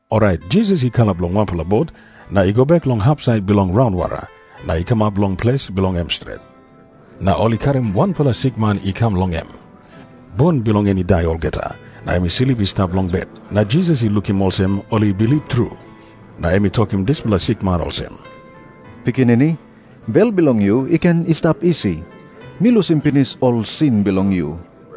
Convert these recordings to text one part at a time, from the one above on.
Orait Jisas i kalap long wanpela bot, na i go bek long hapsait bilong raunwara, na i kamap long ples bilong em stret. Na ol I karim wanpela sikman i kam long em, bun bilong en i dai olgeta, na em i slip i stap long bet. Na Jisas i lukim olsem ol i bilip tru, na em i tokim dispela sikman olsem, "Pikinini, bel bilong yu i ken i stap isi. Mi lusim pinis ol sin bilong yu."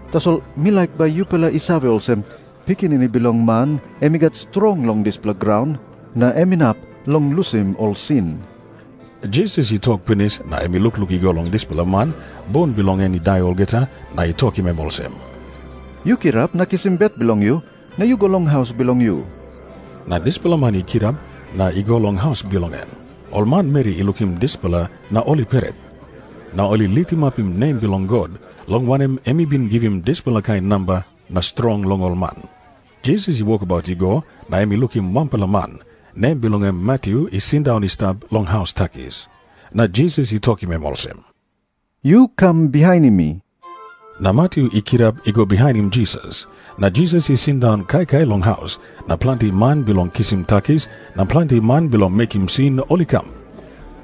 Tasol mi laik bai yupela i save olsem, Pikinini Bilong Man em i gat strong long dispela graun, na em inap long lusim ol sin." Jisas i tok pinis, na em i lukluk i go long dispela man, bun bilong en i dai olgeta, na i tokim em olsem, "Yu kirap na kisim bet bilong yu, na yu go long haus bilong yu." Na dispela man i kirap, na i go long haus bilong en. Ol manmeri i lukim dispela na ol i pret. Na ol i litimapim nem bilong God, long wanem, em i bin givim dispela kain namba na strong long ol man. Jisas i wokabaut i go, na em i lukim wanpela man, nem bilong en Matyu, i sindaun i stap long haus takis. Na Jisas i tokim em olsem, "Yu kam bihainim mi." Na Matyu i kirap i go bihainim Jisas. Na Jisas i sindaun kaikai long haus, na planti man bilong kisim takis na planti man bilong mekim sin ol i kam.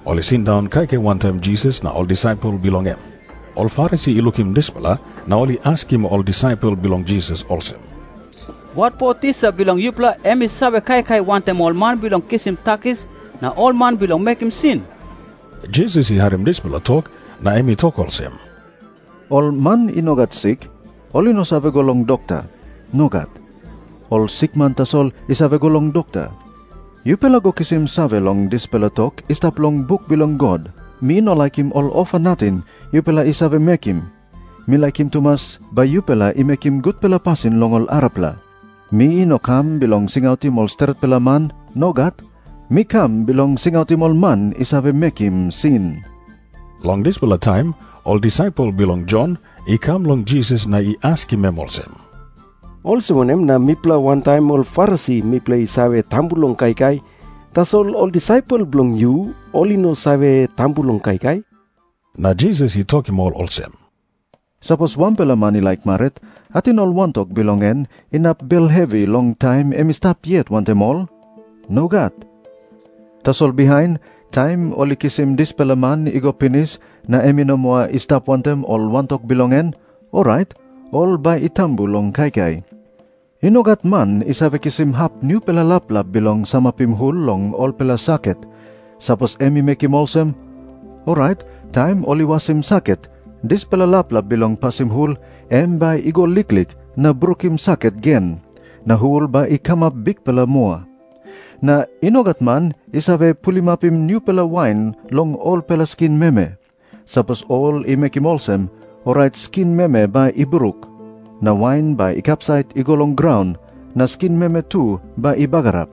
Ol i sindaun kaikai wantaim Jisas na ol disaipel bilong em. Ol Farisi i lukim dispela, na ol i askim ol disaipel bilong Jisas olsem, "Watpo tisa bilong yupela em i save kaikai wantaim ol man bilong kisim takis na ol man bilong mekim sin?" Jisas i harim dispela tok, na em i tok olsem, "Ol man i no gat sik, ol i no save go long dokta. Nogat. Ol sikman tasol i save go long dokta. Yupela go kisim save long dispela tok i stap long buk bilong God, 'Mi no laikim ol ofa nating yupela i save mekim. Mi laikim tumas bai yupela i mekim gutpela pasin long ol arapela.'" Na Jisas i tok moa olsem, "Mi no kam bilong singautim ol stretpela man. Nogat. Mi kam bilong singautim ol man i save mekim sin." Long dispela taim ol disaipel bilong Jon i kam long Jisas na i askim em olsem, "Olsem wanem na mipela wantaim ol Farisi mipela i save tambu long kaikai, tasol ol disaipel bilong yu ol i no save tambu long kaikai?" Na Jisas i tokim ol olsem, "Sapos wanpela man i laik marit, ating ol wantok bilong en inap bel hevi long taim em i stap yet wantaim ol? Nogat. Tasol bihain, taim ol i kisim dispela man i go pinis na em i no moa i stap wantaim ol wantok bilong en, orait ol bai i tambu long kaikai. "I no gat man i save kisim hap nupela laplap bilong samapim hul long olpela saket. Sapos em i mekim olsem, orait taim ol i wasim saket dispela laplap bilong pasim hul em bai i go liklik na brukim saket gen, na hul bai i kamap bikpela moa. Na i no gat man i save pulimapim nupela wain long olpela skin meme. Sapos ol i mekim olsem, orait skin meme bai i bruk, na wain bai i kapsait i go long graun, na skin meme tu bai i bagarap.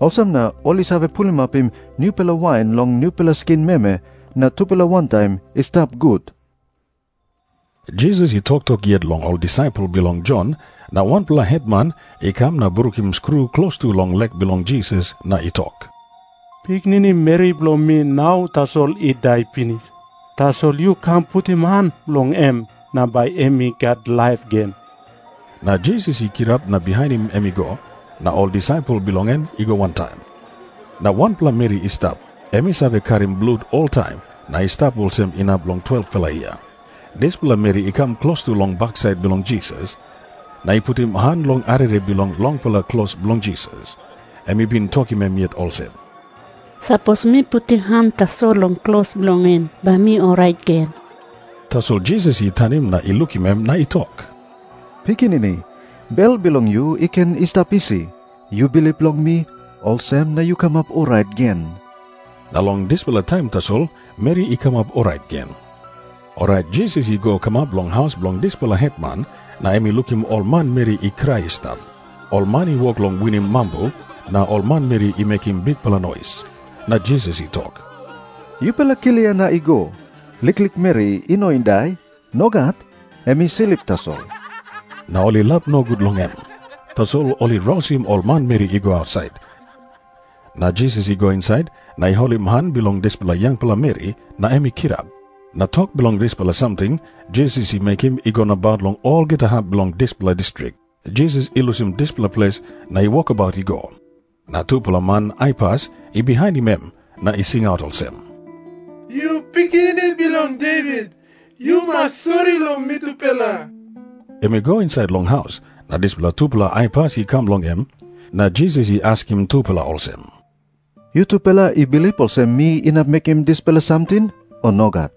Olsem na ol i save pulimapim nupela wain long nupela skin meme, na tupela wantaim i stap gut." klos bilong en Jisas i toktok yet long ol disaipel bilong Jon na wanpela hetman i kam na i brukim skru klostu long lek bilong Jisas na i tok, "Pikinini meri bilong mi nau tasol i dai pinis. Tasol yu kam putim han long em, na bai em i gat laip gen." Na Jisas i kirap na bihainim em i go, na ol disaipel bilong en i go wantaim. Na wanpela meri i stap, em i save karim blut oltaim na i stap olsem inap long 12-pela yia. Dispela meri i kam klostu long baksait bilong Jisas, na i putim han long arere bilong longpela klos bilong Jisas. Em i bin tokim em yet olsem, "Sapos mi putim han tasol long klos bilong en, bai mi orait gen." Tasol Jisas i tanim na I lukim em, na i tok, "Pikinini, bel bilong yu i ken i stap isi. Yu bilip long mi, olsem na yu kamap orait gen." Na long dispela taim tasol meri i kamap orait gen. Orait Jisas i go kamap long haus bilong dispela hetman, na em i lukim ol manmeri i krai i stap. Ol man i wok long winim mambu, na ol manmeri i mekim bikpela nois. Na Jisas i tok, "Yupela klia na I go. Liklik meri i no i dai. Nogat. Em i slip tasol." Na ol i lap nogut long em. … Tasol ol i rausim ol manmeri i go ausait, na Jisas i go insait na i holim han bilong dispela yangpela meri, na em i kirap. Na tok bilong dispela samting Jisas i mekim i go nabaut long olgeta hap bilong dispela distrik. Jisas i lusim dispela ples na i wokabaut i go. Na tupela man aipas i bihainim em na i singaut olsem, "Yu Pikinini Bilong Devit, yu mas sori long mitupela." Em i go insait long haus, na dispela tupela aipas i kam long em. Na Jisas i askim tupela olsem, "Yutupela I bilip olsem mi inap mekim dispela samting, o nogat?"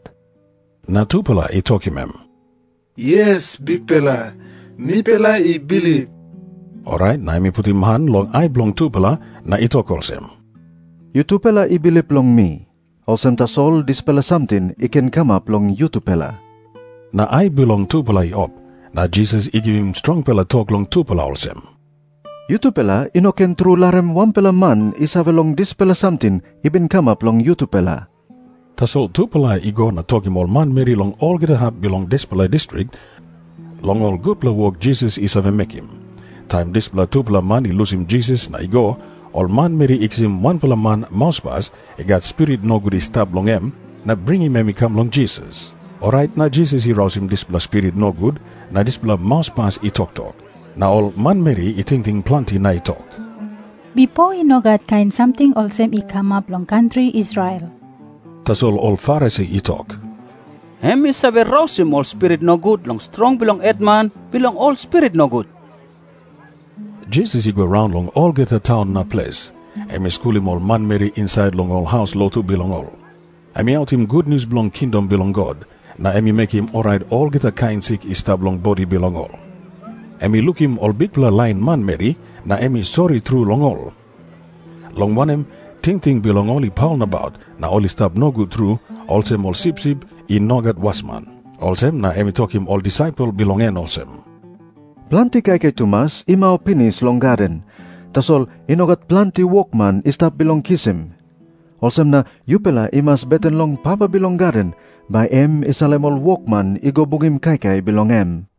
Na tupela i tokim em, "Yes, Bikpela. Mipela i bilip." Orait na em i putim han long ai bilong tupela na i tok olsem, "Yutupela i bilip long mi. Olsem tasol dispela samting i ken kamap long yutupela." Na ai bilong tupela i op. Na Jisas i givim strongpela tok long tupela olsem, "Yutupela i no ken tru larim wanpela man i save long dispela samting i bin kamap long yutupela." Tasol tupela i go na tokim ol manmeri long olgeta hap bilong dispela distrik long ol gutpela wok Jisas i save mekim. Taim dispela tupela man i lusim Jisas na i go, ol manmeri i kisim wanpela man mauspas i gat spirit nogut i stap long em, na bringim em i kam long Jisas. Orait na Jisas i rausim dispela spirit nogut, na dispela mauspas i toktok. Na ol manmeri i tingting planti na i tok, "Bipo i no gat kain samting olsem i kamap long kantri Israel." Tasol ol Farisi i tok, "Em i save rausim ol spirit nogut long strong bilong hetman bilong ol spirit nogut." Jisas i go raun long olgeta taun na ples. Em i skulim ol manmeri insait long ol haus lotu bilong ol. Em i autim gutnius bilong kingdom bilong God, na em i mekim orait olgeta kain sik i stap long bodi bilong ol. Em i lukim ol bikpela lain manmeri, na em i sori tru long ol, long wanem, tingting bilong ol i paul nabaut, na ol i stap nogut tru, olsem ol sipsip i no gat wasman. Olsem na em i tokim ol disaipel bilong en olsem, "Planti kaikai tumas i mau pinis long gaden, tasol i no gat planti wokman i stap bilong kisim. Olsem na yupela i mas beten long Papa bilong gaden, bai em i salim ol wokman i go bungim kaikai bilong en."